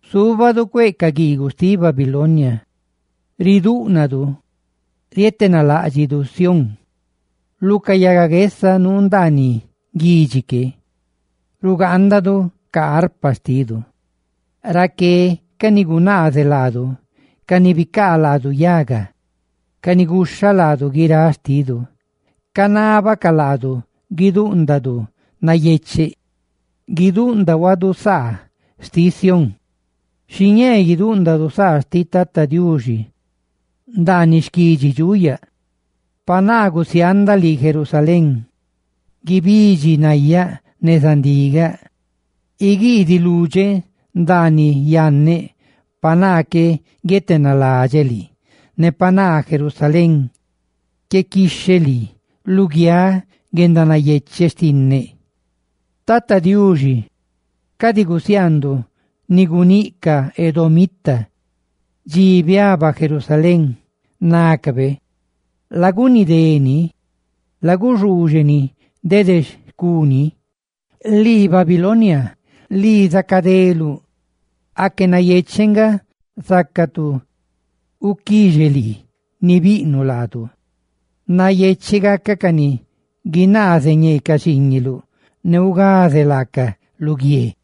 Zúbadu cueꞌ ca guiiguꞌ xtiꞌ Babilonia, ridúꞌnadu ritenaláꞌdxidu Sión. Lu ca yaga guesa nuu ndaaniꞌ guidxi que rugaandaduꞌ ca arpa xtidu. Raqué, ca ni gunaazeꞌ ne bicaa yaga laadu, ca ni guxha laadu guiráꞌ xtidu, canábacaꞌ laadu guidúꞌndadu nayecheꞌ; ¡guidúꞌndahuadu saa xtiꞌ Sión! Guidúꞌndahuadu saa xtiꞌ Tata Diuxi ndaaniꞌ xquidxi ca dxuꞌ la? ¡Pa naa gusiaandaꞌ lii, Jerusalén, guibidxi nayáꞌ neza ndigaꞌ diꞌ! ¡Iguiidiꞌ ludxeꞌ ndaaniꞌ yanneꞌ pa naa qué guietenaladxeꞌ lii, ne pa naa, Jerusalén, qué quixheꞌ lii luguiáꞌ guendanayecheꞌ xtinneꞌ! Tata Diuxi, cadi gusiaanduꞌ ni guníꞌ ca edomita, dxi biaba Jerusalén, nácabe: «¡Laguni dé ni, laguxuuxe ni dede xcuni!» ¡Lii Babilonia, lii zacadeluꞌ! ¡Aque nayecheꞌ nga zaca tu guquixe lii ni biꞌnuꞌ laadu! ¡Nayecheꞌ gacaꞌ ca ni guinaaze ñee ca xiiñuꞌ, ne ugaze laacaꞌ lu guie!